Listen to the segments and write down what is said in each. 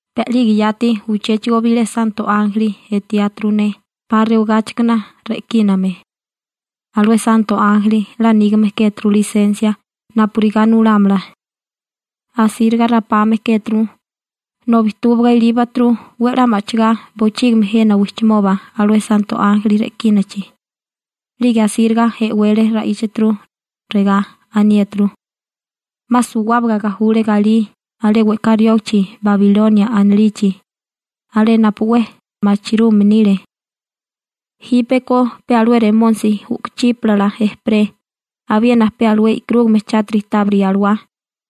Pe a'lige yati uchéchigo bilé santo ánjeli etiáturu ne 'pa rewagáchikana re'kíname. Alué santo ánjeli 'la nígame kéturu lisensia napurigá nulámala. Asíriga rapame kéturu, nobi túbaga ilíbaturu 'we 'la ma'chigá bochígimi jena wijchimoba alué santo ánjeli re'kínachi. 'Lige asíriga e'wele ra'íchaturu, regá aniéturu: ―'Ma suwábaga gajule galí alé we'ká riógichi Babilonia anilichi, alé napu 'we machirume nile. Jípeko pe alué remónisi u'kuchípala ejperé, abiena pe alué e'karúgame chátiri tábiri alawá,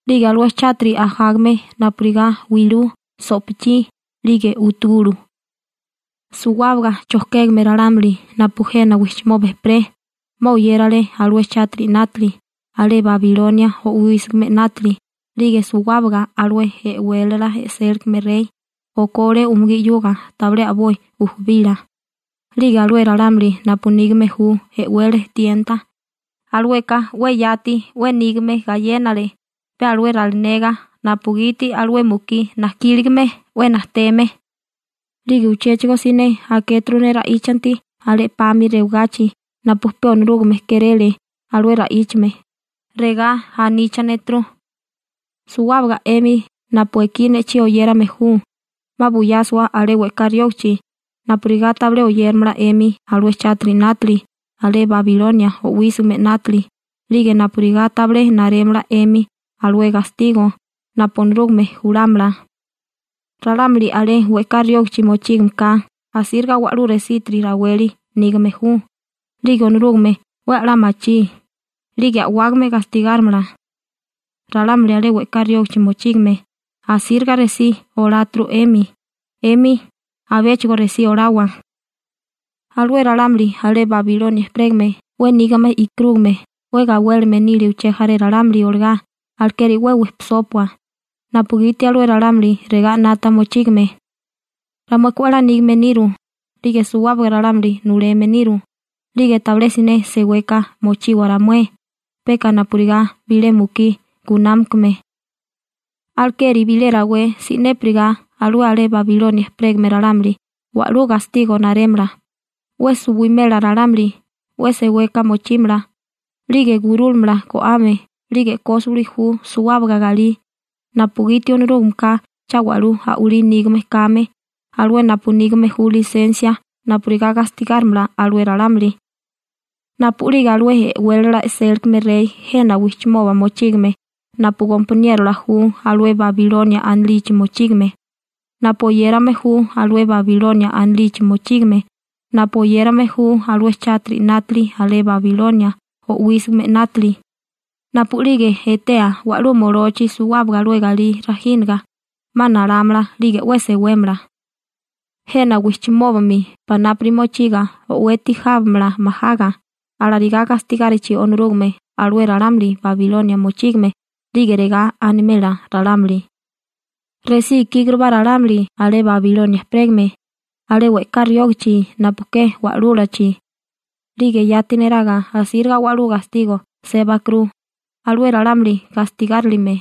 'lige alué chátiri ajágame napurigá wilú, so'pichí, 'lige utugulu. Suwábaga chojkégame ralámuli napu jena wijchimoba ejperé 'ma oyérale alué chátiri 'nátili alé Babilonia o'wísigime 'nátili 'lige suwábaga alué e'wélala e'sélikame rey okole umugí 'yuga tabilé a'boi ujubila, 'lige alué ralámuli napu nígame ju e'wele tienta, alueka 'we yati 'we nígame gayénale pe alué ralinega napugiti alué mukí najkíligame 'we najteme. 'Lige uchéchigo siné akéturu ne ra'íchanti alé 'pami rewagachi napu pe Onorúgame kéréle alué ra'íchame, regá aníchaneturu: ―Suwábaga 'emi napu ekí ne'chí oyérame ju 'ma buyásiwa alé we'ká riógichi napurigá tabilé oyéramala 'emi alué chátiri 'nátili alé Babilonia o'wísigime 'nátili 'lige napurigá tabilé narémala 'emi alué gastigo napu Onorúgame julámala. Ralámuli alé we'ká riógichi mochígame ka asíriga wa'lú resitiri raweli nígame ju, 'lige Onorúgame 'we 'la machí, 'lige a'wágame gastigárimala. Ralámuli alé we'ká riógichi mochígame asíriga resí oláturu 'emi, 'emi abéchigo resí olawa. Alué ralámuli alé Babilonia ejperégame 'we nígame e'karúgame 'we gawélime nile uché jaré ralámuli olagá alekeri 'we wejpisópua, napugiti alué ralámuli regá 'nata mochígime: «Ramueka 'we 'la nígame niru, 'lige suwábaga ralámuli nuleme niru, 'lige tabilé siné seweka mochiwa ramué, peka napurigá bilé mukí gunámakame.» Alekeri bilé rawé si'népiriga alué alé Babilonia ejperégame ralámuli wa'lú gastigo narémala, 'we suwimela ralámuli, 'we seweka mochímala, 'lige gurúlamala go'ame 'lige e'kósiwili ju suwábaga galí, napugiti Onorúgameka cha wa'lú a'walí nígame kame, alué napu nígame ju lisensia napurigá gastigárimala alué ralámuli. Napu'lige alué e'wélala e'sélikame rey jena wijchimoba mochígime napu gompaniérola ju alué Babilonia anilichi mochígame, napu oyérame ju alué Babilonia anilichi mochígame, napu oyérame ju alué chátiri 'nátili alé Babilonia o'wísigime 'nátili, napu'lige etea wa'lú molochi suwábaga alué galí rajínaga 'ma nalámala 'lige 'we sewémala. Jena wijchimóbami panápuri mochiga o'weti jábamala majaga, alarigá gastigárichi Onorúgame alué ralámuli Babilonia mochígame 'lige regá animela ralámuli: ―Resí ikígurubá ralámuli alé Babilonia ejperégame, alé we'ká riógachi napu ke wa'lúlachi. 'Lige yati neraga asíriga wa'lú gastigo sébakuru alué ralámuli gastigárilime.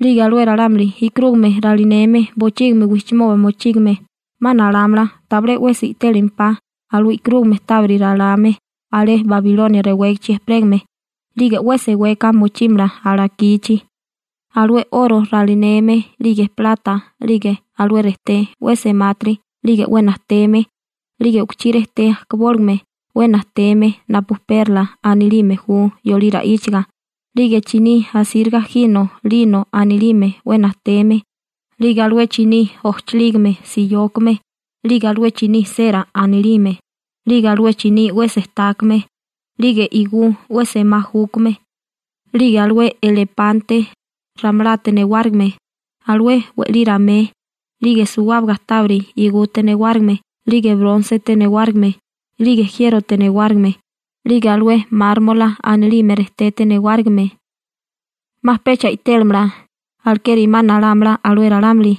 'Lige alué ralámuli e'karúgame ralineme bochígimi wijchimoba mochígame 'ma nalámala tabilé 'wesi i'télimempá alué e'karúgame tábiri ralame alé Babilonia rewégichi ejperégame 'lige 'we seweka mochímala alakichi, alué 'oro ralineme, 'lige plata, 'lige alué rejté 'we semátiri 'lige 'we najteme, 'lige u'kuchí rejté ajkabóligame 'we najteme napu perla anilime ju yolí ra'íchaga 'lige chiní asíriga jino «lino» anilime 'we najteme, 'lige alué chiní ojchilígime siyókame 'lige alué chiní sera anilime, 'lige alué chiní 'we sejtákame, 'lige igú 'we semá júkame, 'lige alué elepante ramalate newárigime, alué we'lí ramé, 'lige suwábaga tábiri igute newárigime 'lige brónsete newárigime, 'lige jiérote newárigime, 'lige alué mármola anilime rejtete newárigime. 'Ma pecha i'télimala, alekeri 'ma nalámala alué ralámuli.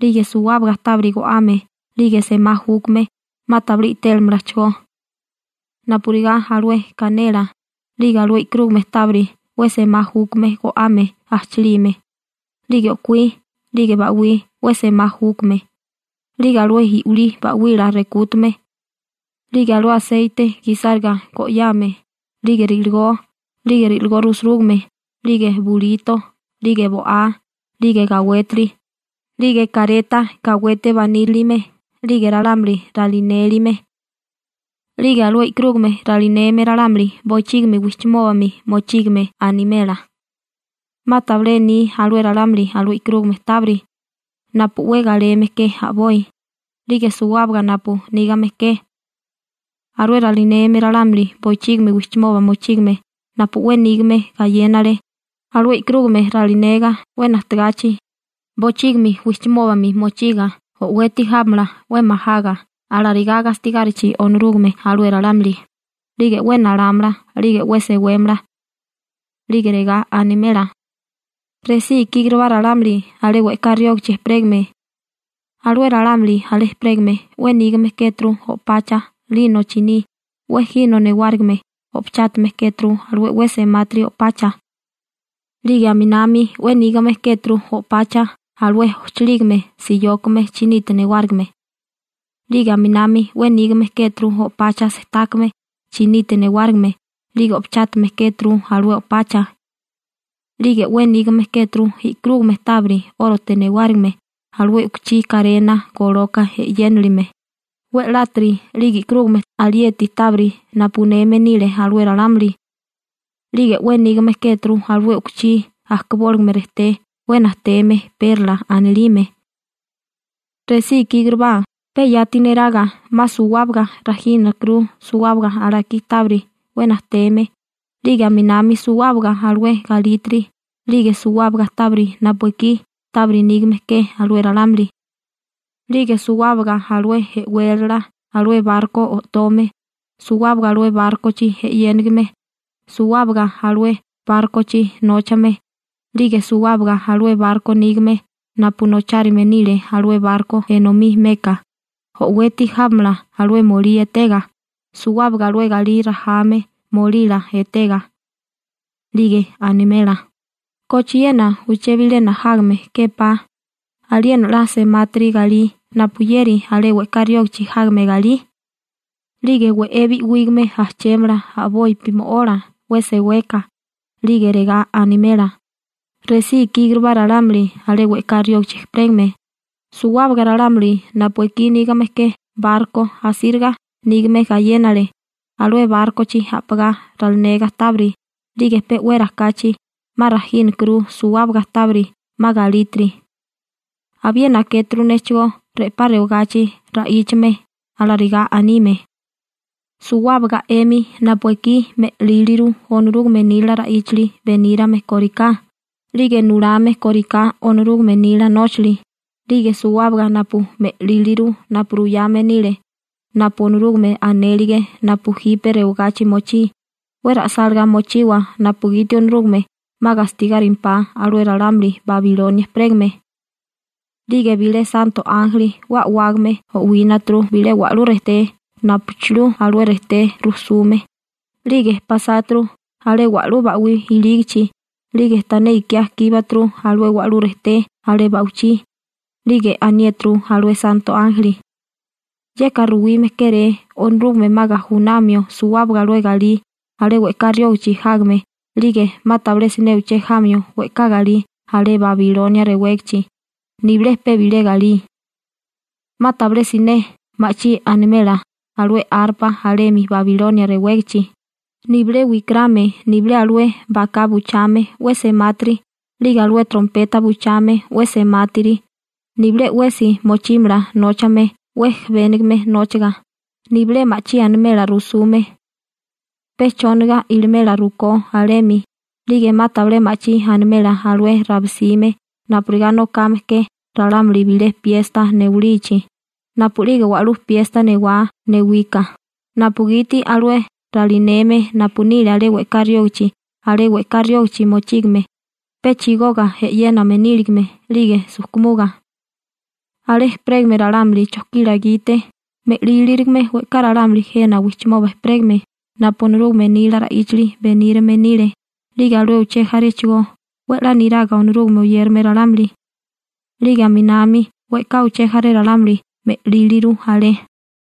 'Lige suwábaga tábiri go'ame 'lige semá júkame 'ma tabilé i'télimalachigó napurigá alué kanela, 'lige alué e'karúgame tábiri 'we semá júkame go'ame ajchilime, 'lige o'kuí, 'lige ba'wí 'we semá júkame, 'lige alué i'wilí ba'wila rekútame, 'lige alué aseite gisáriga go'yame, 'lige ri'ligó, 'lige ri'ligó rusurúgame, 'lige bulito, 'lige bo'á, 'lige gawétiri, 'lige kareta gawete banírilime, 'lige ralámuli ralinélime. 'Lige alué e'karúgame ralineme ralámuli bochígimi wijchimóbami mochígame animela: ―'Ma tabilé ni alué ralámuli alué e'karúgame tábiri napu 'we galeme ke a'boi, 'lige suwábaga napu nígame ke. Alué ralineme ralámuli bochígimi wijchimoba mochígame napu 'we nígame gayénale alué e'karúgame ralinega 'we najtegachi, bochígimi wijchimóbami mochiga o'weti jábamala 'we majaga alarigá gastigárichi Onorúgame alué ralámuli, 'lige 'we nalámala 'lige 'we sewémala, 'lige regá animela: ―Resí ikígurubá ralámuli alé we'ká riógichi ejperégame. Alué ralámuli alé ejperégame 'we nígame kéturu o'pacha «lino» chiní 'we jino newárigime o'pachátame kéturu alué 'we semátiri o'pacha. 'Lige aminami 'we nígame kéturu o'pacha alué ojchilígime siyókame chinite newárigime. 'Lige aminami 'we nígame kéturu o'pacha sejtákame chinite newárigime 'lige o'pachátame kéturu alué o'pacha. 'Lige 'we nígame kéturu e'karúgame tábiri 'órote newárigime alué u'kuchí karena goloka e'yénilime, we'látiri 'lige e'karúgame alieti tábiri napu uneme nile alué ralámuli. 'Lige 'we nígame kéturu alué u'kuchí ajkabóligame rejté 'we najteme perla anilime. Resí ikígurubá, pe yati neraga 'ma suwábaga rajínakuru suwábaga alakí tábiri 'we najteme 'lige aminami suwábaga alué galítiri 'lige suwábaga tábiri napu ekí tábiri nígame ke alué ralámuli. 'Lige suwábaga alué e'wélala alué barko o'tome, suwábaga alué bárkochi e'yénigime, suwábaga alué bárkochi nóchame, 'lige suwábaga alué barko nígame napu nochárime nile alué barko enomí meka, o'weti jábamala alué molí etega, suwábaga alué galí rajame molila etega. 'Lige animela: ―¿Kochiena uché bilena jágame képá aliena 'la semátiri galí napuyeri alé we'ká riógichi jágame galí? 'Lige we'é bi'wígame ajchémala a'bopi mo'ola 'we seweka, 'lige regá animela: ―Resí ikíkurubá ralámuli alé we'ká riógichi ejperégame, suwábaga ralámuli napu ekí nígame ke barko asíriga nígame gayénale, alué bárkochi a'pagá ralinega tábiri 'lige pe'wera kachi 'ma rajínakuru suwábaga tábiri 'ma galítiri. Abiena akéturu néchigó re'pá rewagachi ra'íchame, alarigá anime: ―Suwábaga 'emi napu ekí me'líliru Onorúgame nila ra'íchali benírame kóriká, 'lige nulame kóriká Onorúgame nila nóchali, 'lige suwábaga napu me'líliru napu ruyame nile napu Onorúgame anélige napu jipe rewagachi mochí, 'we ra'sálagá mochiwa napugiti Onorúgame 'ma gastigárimpá alué ralámuli Babilonia ejperégame. 'Lige bilé santo ánjeli 'we a'wágame o'wínaturu bilé wa'lú rejté napuchilú alué rejté rusume, 'lige pasáturu alé wa'lú ba'wí ilígichi, 'lige tané ikiá kíbaturu alué wa'lú rejté alé ba'wichí, 'lige aniéturu alué santo ánjeli: ―Yeka ruwime kéré Onorúgame 'ma gajunamio suwábaga alué galí alé we'ká riógichi jágame 'lige 'ma tabilé siné uché jamio we'ká galí alé Babilonia rewégichi, nibilé pe bilé galí. 'Ma tabilé siné ma'chí animela alué arpa alemi Babilonia rewégichi, nibilé wikarame, nibilé alué baká buchame 'we semátiri 'lige alué trompeta buchame 'we semátiri, nibilé 'wesi mochímala nóchame 'we jebénigame nóchaga, nibilé ma'chí animela rusume, pe chóniga ilimela rukó alemi, 'lige 'ma tabilé ma'chí animela alué rabisime napurigá nokame ke ralámuli bilé piesta newalichi, napu'lige wa'lú piesta newá newika, napugiti alué ralineme napu nile alé we'ká riógichi alé we'ká riógichi mochígame pe chigoga e'yéname níligame 'lige sujkumuga. Alé ejperégame ralámuli chojkila gite me'lílirigame we'ká ralámuli jena wijchimoba ejperégame napu Onorúgame nila ra'íchali benírime nile 'lige alué uché jaréchigó 'we 'la niraga Onorúgame oyérame ralámuli. 'Lige aminami we'ká uché jaré ralámuli me'líliru alé.